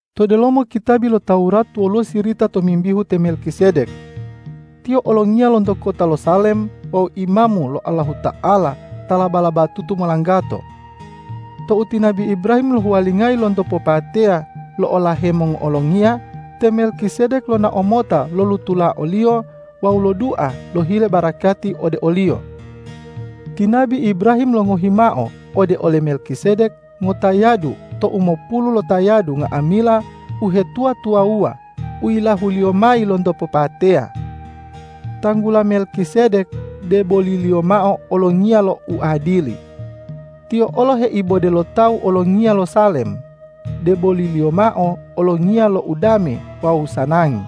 To delomo kitabi lo Tawurat woluwo sirita tomimbihu te Melkisedek. Tiyo olongiya lonto kota lo Salem wawu imamu lo Allahuta'ala ta laba-labatutu molanggato. Tou ti nabi Ibrahim lohuwalingayi lonto popateya lo'olahe mongo'olongiya, te Melkisedek lonao mota lolutula oliyo wawu lodua lohile barakati ode oliyo. Ti nabi Ibrahim longohi mao ode ole Melkisedek ngotayadu to umopulu lotayadu nga'amila uhetuwa-tuwawuwa u yilahuliyo mayi lonto popateya. Tanggula Melkisedek, deboliliyo mao olongiya lo uadili. Tiyo olo heibode lo tawu olongiya lo Salem, deboliliyo mao olongiya lo udame wawu sanangi.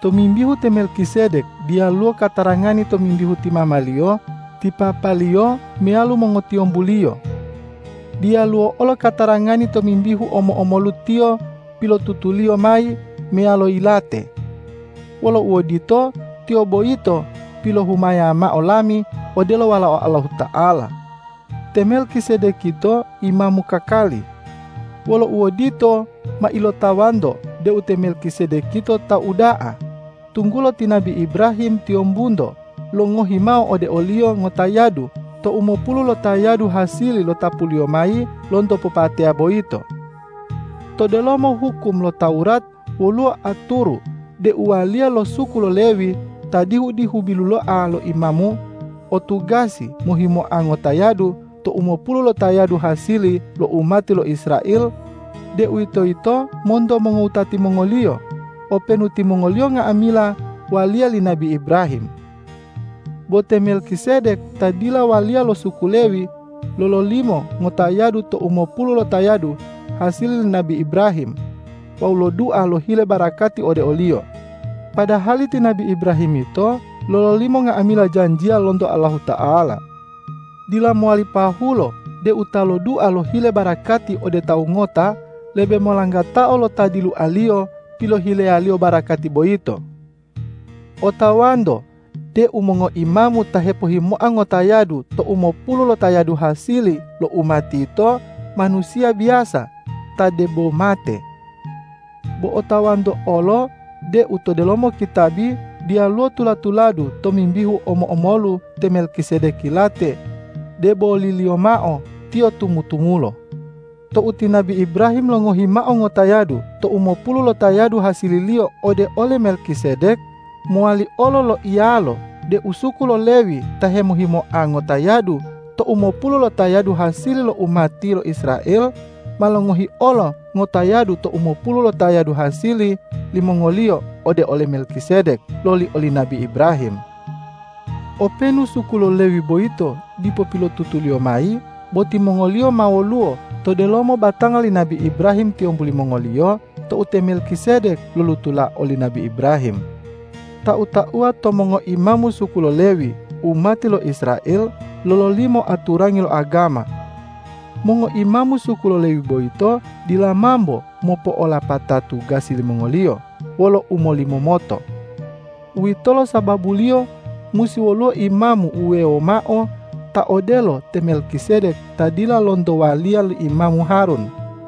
Tomimbihu te Melkisedek diyaluwo katarangani tomimbihu ti mamaliyo, ti papaliyo meyalo mongotiyombuliyo. Diyaluwo olo katarangani tomimbihu omo-omolu tiyo pilotutuliyo mayi meyalo yilate. Wolo uodito, tiyo boyito pilohumaya mao lami odelo Walao Allahuta'ala. Te Melkisedek yito imamu kakali. Wolo uodito, ma ilotawanto deu te Melkisedek yito tawu uda'a, tunggulo ti nabi Ibrahim tiyombunto longohi mao ode oliyo ngotayadu to umopulu lotayadu hasili lotapuliyo mayi lonto popateya boyito. To delomo hukum lo Tawurat woluwo aturu deu waliya lo suku lo Lewi ta dihu-dihu biluloa lo imamu o tugasi mohimoa ngotayadu to umopulu lotayadu hasili lo umati lo Israel, deuwitoyito monto mongowutati mongoliyo, openu timongoliyo nga'amila waliya li nabi Ibrahim. Bo te Melkisedek ta dila waliya lo suku lo Lewi, lololimo ngotayadu to umopulu lotayadu hasili li nabi Ibrahim wawu lodua lohile barakati ode oliyo, padahali ti nabi Ibrahim yito lololimo nga'amila janjiya lonto Allahuta'ala. Dila mowali pahulo deu ta lodua lohile barakati ode tawu ngota, lebe molanggatao lo ta dilualiyo pilohileyaliyo barakati boyito. Otawanto deu mongoimamu ta hepohimoa ngotayadu to umopulu lotayadu hasili lo umati yito manusiya biyasa ta debo mate. Bo otawanto olo deu to delomo kitabi diyaluwo tula-tuladu tomimbihu omo-omolu te Melkisedek yilate, deboliliyo mao tiyo tumu-tumulo. Tou ti nabi Ibrahim longohi mao ngotayadu to umopulu lotayadu hasililiyo ode ole Melkisedek, mowali olo loiyalo deu suku lo Lewi ta hemohimoa ngotayadu to umopulu lotayadu hasili lo umati lo Israel, ma longohi olo ngotayadu to umopulu lotayadu hasili limongoliyo ode ole Melkisedek loli oli nabi Ibrahim. Openu suku lo Lewi boyito dipo pilotutuliyo mayi, bo timongoliyo ma woluwo to delomo batanga li nabi Ibrahim tiyombu limongoliyo tou te Melkisedek lolutula oli nabi Ibrahim. Tau-tauwa to mongoimamu suku lo Lewi umati lo Israel, lololimo aturangi lo agama. Mongoimamu suku lo Lewi boyito dila mambo mopo'olapata tugasi limongoliyo wolo umolimomoto. Uwitolo sababuliyo musi woluwo Imamu wuwewo mao ta odelo te Melkisedek ta dila lonto waliya li imamu Harun.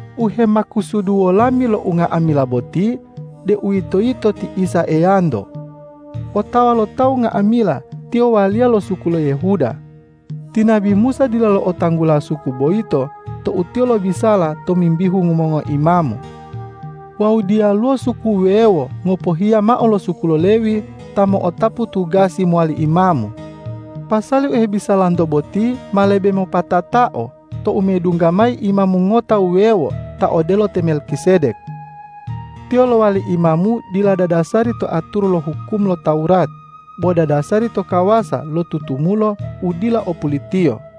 U hemakusuduwo lami lo unga'amila boti, deuwitoyito ti Isa Eyanto. Otawa lo tawu nga'amila Tiyo waliya lo suku lo Yehuda. Ti nabi Musa dila lo'otanggula suku boyito tou tiyo lobisala tomimbihu mongoimamu. Wawu diyaluwo suku wuwewo ngopohiya mao lo suku lo Lewi ta mo'otapu tugasi mowali imamu. Pasali u hebisalanto boti ma lebe mopatatao tou medungga mayi Imamu ngota wuwewo ta odelo te Melkisedek. Tiyo lowali Imamu dila dadasari to aturu lo hukum lo Tawurat, bo dadasari to kawasa lo tutumulo u dila o pulitiyo.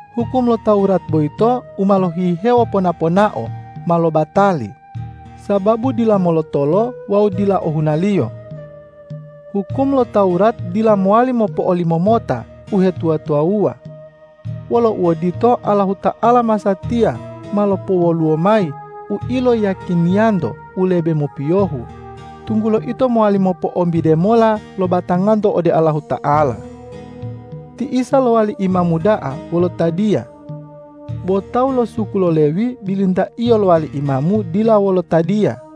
Hukum lo Tawurat boyito u ma lohihewo pona-ponao ma lobatali, sababu dila molotolo wawu dila ohunaliyo. Hukum lo Tawurat dila mowali mopo'olimomota uhetuwa-tuwawuwa. Wolo uodito, Allahuta'ala masatiya ma lopowoluwo mayi u iloyiyakiniyanto u lebe mopiyohu, tunggulo ito mowali mopo'ombide mola lo batanganto ode Allahuta'ala. Ti Isa lowali Imamu da'a wolo tadiya. Bo tawu lo suku lo Lewi bilintaiyo lowali imamu dila wolo tadiya.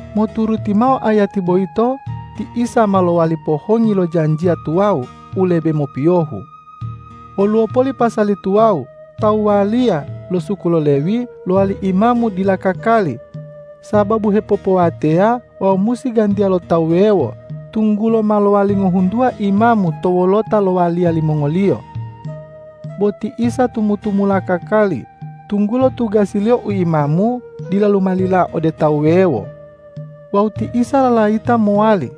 Moturuti mao ayati boyito, ti Isa ma lowali pohongi lo janjiya tuwawu u lebe mopiyohu. Woluwo poli pasali tuwawu, tawu waliya lo suku lo Lewi lowali imamu dila kakali sababu hepopowateya wawu musi gantiya lo tawu wuwewo, tunggulo ma lowali ngohuntuwa imamu to wolota lo waliya limongoliyo. Bo ti Isa tumu-tumula kakali, tunggulo tugasi-Liyo u imamu dila lumalila ode tawu wuwewo. Wawu ti Isa lalayita mowali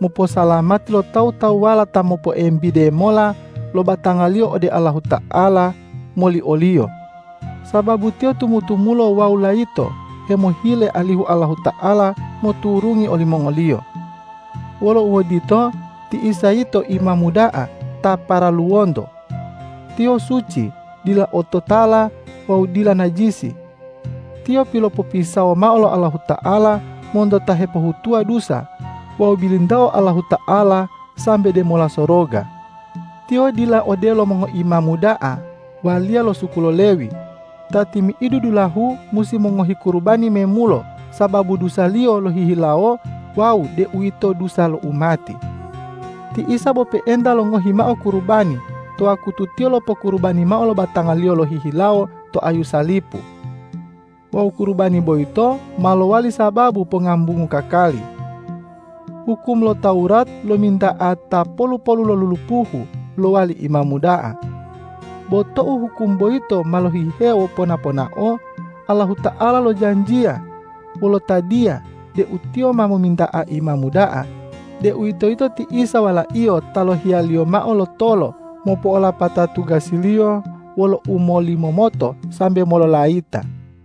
moposalamati lo tawu-tawuwala ta mopoembide mola lo batangaliyo ode Allahuta'ala moli o-Liyo, sababu Tiyo tumu-tumulo wawu layito hemohile alihu Allahuta'ala moturungi olimongoliyo. Wolo uodito, ti Isa yito Imamu da'a ta paraluwonto. Tiyo suci, dila ototala wawu dila najisi. Tiyo pilopopisawo mao lo Allahuta'ala monto ta hepohutuwa dusa wawu bilintao Allahuta'ala sambe demola soroga. Tiyo dila odelo mongoimamu da'a waliya lo suku lo Lewi, ta timi'idu dulahu musi mongohi kurubani memulo sababu dusaliyo lohihilawo wawu deuwito dusa lo umati. Ti Isa bo pe'enta longohi mao kurubani to wakutu Tiyo lopokurubani mao lo batanga-Liyo lohihilawo to ayu salipu. Wawu kurubani boyito ma lowali sababu pongambungu kakali. Hukum lo Tawurat lominta'a ta polu-polu lo lulupuhu lowali imamu da'a. Bo tou hukum boyito ma lohihewo pona-ponao, Allahuta'ala lojanjiya wolo tadiya deu Tiyo ma mominta'a Imamu da'a, deuwitoyito ti Isa Wala-Iyo ta yilohiya-Liyo mao lotolo mopo'olapata tugasi-Liyo wolo umolimomoto sambe mololayita.